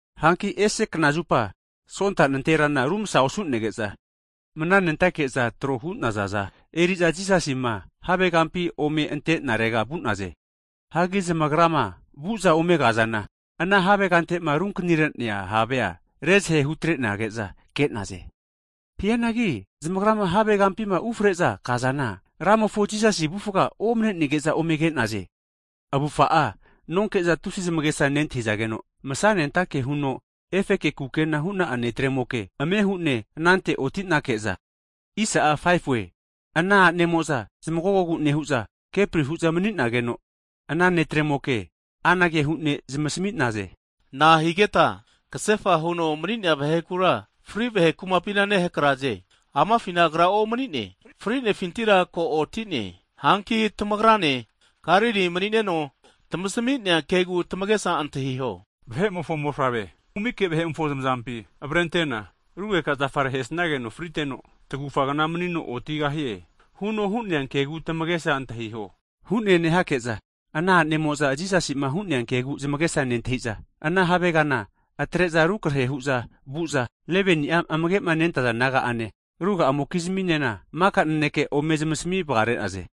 Hanki ese knazupa Sonta nanterana rumsa osu'nege'za, mananentake'zama tro hu'nazaza eri'za Jisasi afufga'ama havegampi ome ante'narega vu'naze. Hagi zamagrama vu'za ome kazana, ana havegante'ma runkanire'nea havea rezahe hutrenage'za ke'naze. Hianagi zamagrama havegampima ufre'za kazana, Ramofo Jisasi avufga omnenege'za ome ke'naze. Avufa'a nonke'za tusi zamagesa nentahizageno, masanentake huno efeke kukena hu'na'a netremoke ame hu'ne anante otinake'za, ana a'nemo'za zamagogogu nehu'za, kepri hu'za mani'nageno, ana netremoke anage hu'ne zamasami'na'e. Na'a higeta kasefa huno mani'nea vahekura, fri vahe kumapina nehakraze? Amafina Agra omanine, frinefintira ko oti'ne. Hanki tamagranema Galili mani'neno tamasami'nea kegu tamagesa antahiho. Vahe'mofo Mofavrea kumike vahe'mofo zamazampi avrentena, rugeka zafare ahesnageno friteno, tagufa kna manino otigahie, huno hu'nea kegu tamagesa antahiho, hu'ne nehake'za ana a'nemo'za Jisasi'ma hu'nea kegu zamagesa nentahi'za, ana havegana atre'za rukrehe hu'za vu'za, 11ni'a amagema nentaza naga'ane, ruga'amokizminena maka nanekea ome zamasmi vagare'naze.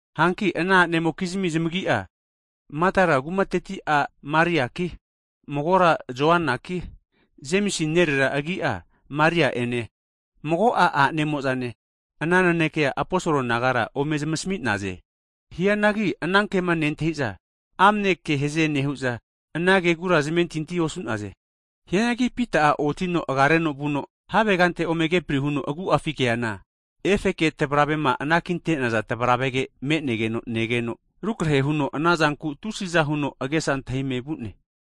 Hanki ana a'nemokizmi zamagi'a, Makdala kumateti' a' Mariaki, magora Joanaki, Jemisi nerera agi'a Maria ene, mago'a a'nemo'zane, ana nanekea aposolo nagara ome zmasami'naze. Hianagi anankema nentahiza amne kehaze nehu'za, anankegura zamentinti osu'naze. Hianagi Pita'a otino agareno vuno havegante ome kepri huno agu'afi keana, efeke tavravema ana kinte'naza tavravege me'negeno negeno, rukrahe huno anazanku tusiza huno agesa antahime vu'ne.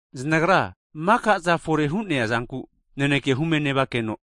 Zanagra maka'za fore'ma hu'nea zanku naneke hume nevakeno,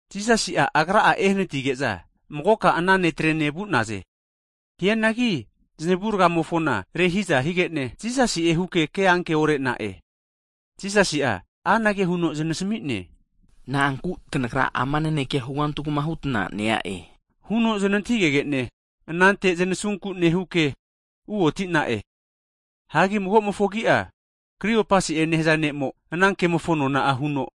Jisasi'a Agra'a ehanatige'za magoka ana netrene vu'naze. Hianagi zanavurgamofona rehiza higene Jisasi'e huke ke anke orena'e. Jisasi'a anage huno zanasami'ne, Na'anku ama nanekea tanagra hugantugma hutna nea'e? huno znantahigegene anante zanasunku nehuke uoti'na'e. Hagi magomofo agi'a Kriopasi'e nehaza ne'mo ana kemofo nona'a huno,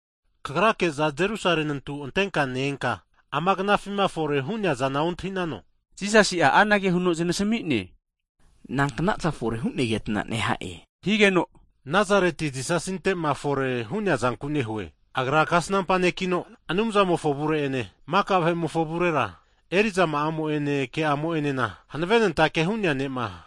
kagrake'za Jerusalemi nantu antenka ne-enka amagnafima fore hu'nea zana ontahi'nano? Jisasi'a anage huno zanasami'ne, Nanknaza fore hu'negeta neha'e? Higeno Nazareti Jisasinte'ma fore hu'nea zanku nehu'e. Agra kasnampa ne'kino, Anumzamofo avure'ene, maka vahe'mofo avurera, eri'zama'amo'ene keamo'enana hanavenentake hu'nea ne'ma,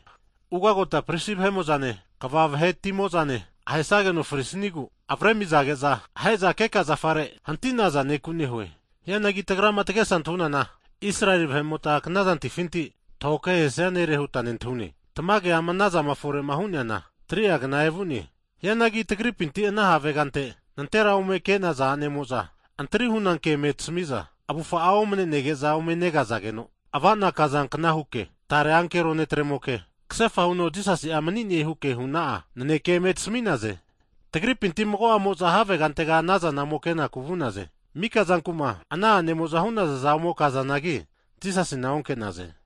ugagota pristi vahe'mo'zane, kva vahetimo'zane ahesageno frisniegu, avarezamizage'za ahe'za keka zafare hantinaza ne'ku nehu'e. Hianagi tagrama tagesa antahunana, Israeli vahe'mota knazantifinti tahoke ahesia nere huta nentahune. Tamage, ama anazama fore'ma hu'neana 3'a zagegna evu'ne. Hianagi tagripinti ana havegante nanterame ome ke'naza, a'nemo'za antri hu'na ke eme tasamiza, avufa'a omne'nege'za ome negazageno, avana kazankna huke, tare ankero netremoke, kasefa huno Jisasi'a mani'ne huke huna'a naneke eme tasami'naze. Hagi tagripinti mago'amo'za havegantega anaza ome kenaku vu'naze. Mika zanku'ma ana anemo'za hu'nazaza ome kazanagi, Jisasina onke'naze.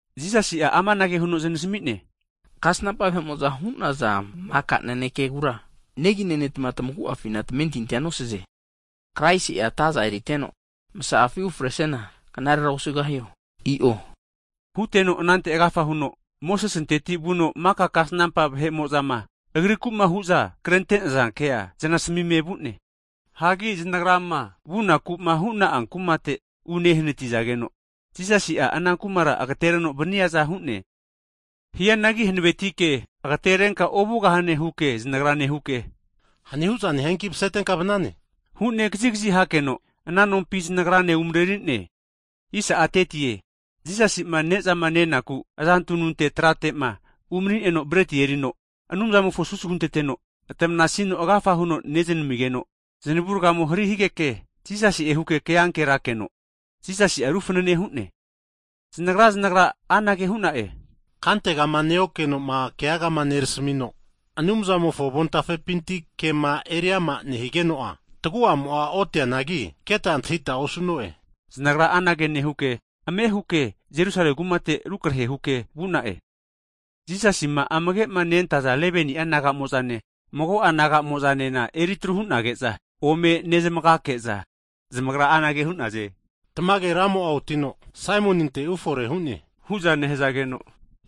Jisasi'a amanage huno zanasami'ne, Kasnampa vahe'mo'za hu'naza maka nanekegura negi nenetma tamagu'afina tamentintia nosaze! Kraisi'a ataza eriteno, masa'afi ufresiana, knarera osugahio? I'o. Huteno anante agafa huno, Mosesinteti vuno maka kasnampa vahe'mo'zama, Agrikuma hu'za krente'naza kea eriama huno zanasamime vu'ne. Hagi zanagrama vunaku'ma hu'na'a kumate unehanatizageno, Jisasi'a ana kumara agatereno vaniaza hu'ne. Hianagi hanavetike agaterenka ovugahane huke zanagra nehuke, hani huza nehianki masetenka vanane hu'ne kazigazi hakeno, ana nompi zanagrane umareri'ne. Jisasima nezama nenaku trate umanineno breti erino, Anumzamofo susu hunteteno, tamanasino agafa huno neznamigeno, zanavurgamo hari higeke Jisasi'e huke ke ankenerakeno, Jisasi'a ru fanane hu'ne. Zanagra zanagra anage hu'na'e, kantegama neokenoma keagama nerasamino, Anumzamofo avontafepinti kema eriama nehigeno'a, tagu'amo'a otianagi, keta antahita osu'no'e. Zanagra anage nehuke, ame huke rukrehe huke Jerusalemi kumate vu'na'e. Jisasima amage'ma nentaza 11ni'a disaipol naga'mo'zane, mago'a naga'moza'nena eri atru hu'nage'za ome nezmagake'za, Zamagra anage hu'naze, tamage Ramo'a otino, Saimoninte ufore hu'ne! Hu'za nehazageke,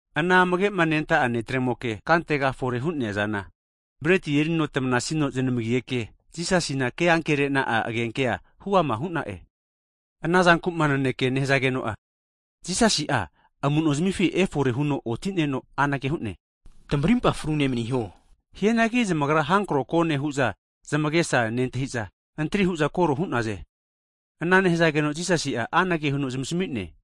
ana amagema nenta'a disaipol netremoke kantega fore hu'neazane, breti erino tamanasino znamigeke, Jisasina ke ankerena'a agenke huama hu'na'e. Ana zanku'ma naneke nehazageno'a, Jisasi'a amu'nozimifi efore huno otineno anage hu'ne, Tamarimpa frune maniho. Hianagi zamagra havi avamu negone hu'za zamagesa nentahi'za, antri hu'za koro hu'naze. Ana nehazageno Jisasi'a anage huno zmasamine.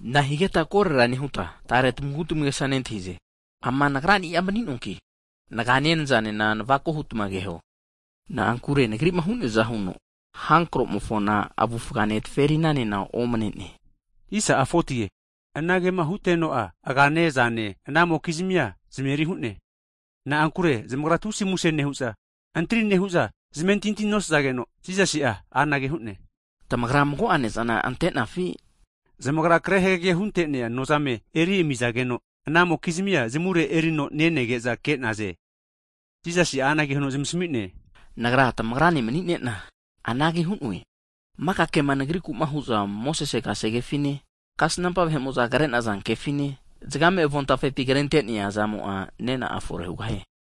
Nahigeta korera nehuta, tare tamagutmagesa nentahize? Ama Nagrani'a mani'noanki nagane, nazanena navako hutma keho. Na'ankure Nagrima hu'neaza huno, hankromofona avufgane zaferinanena omane'ne. Anagema huteno'a, agane, azane anamokizmi zameri hu'ne. Na'ankure zamagra tusi muse nehu'za, antri nehu'za zamentinti nosazageno, Jisasi'a anage hu'ne, Tamagra mago'a ne'zana ante'nazafi? Zamagra kre hagege hunte'nea nozame eri amizageno, anamokizmi zamure erino nenege'za ke'naze. Jisasi'a anage huno zamasmi'ne, Nagra tamagrane mani'nena, anage hu'noe, maka kema Nagrikuma hu'za Mosese kasegefine, kasnampa vahe'mo'za krenaza kefine, zagame avontafepima krente'nea zamo'a nena'a fore hugahie.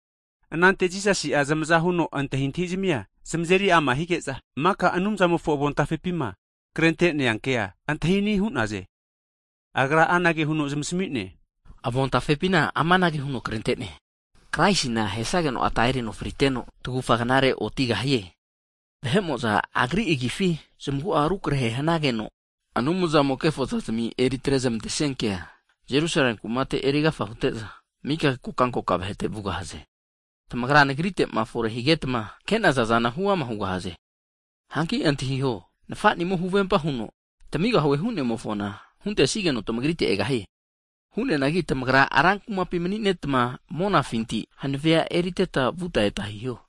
Anante Jisasi'a zamaza huno antahintahizmia zamazeri ama hige'za, maka Anumzamofo avontafepima krente'nea kea antahini hu'naze. Agra anage huno zamasami'ne, Avontafepina amanage huno krente'ne, Kraisina ahesageno ata erino friteno, tagufa knare otigahie. Vahe'mo'za Agri agifi, zamagu'a rukrahe hanageno, Anumzamo'a kefozazimi eritrezamantesia kea, Jerusalemi kumate erigafa hute'za, mika kokankoka vahete vugahaze. Tamagra Nagritema fore higetma ke'naza zana huama hugahaze. Hanki antahiho, Nafa'nimo huvempa huno tamigahue hu'nemofona, huntesugeno tamagrite egahie. Hu'neanagi tamagra (Jerusalemi) rankumapi manineta monafinti hanavea eriteta vuta eta hiho.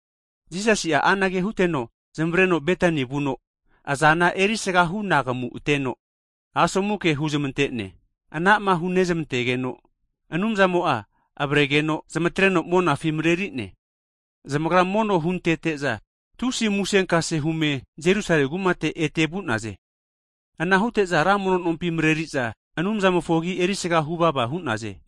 Jisasi'a anage huteno zamavareno Betani vuno azana erisaga hunagamuteno, asomu ke huzmante'ne. Anama hunezmantegeno, Anumzamo'a avregeno zmatreno monafi mareri'ne. Zamagra mono huntete'za, tusi musenkase hume Jerusalemi kumate ete vu'naze. Ana hute'za ra mono nompi mareri'za Anumzamofo agi erisaga huvava hu'naze.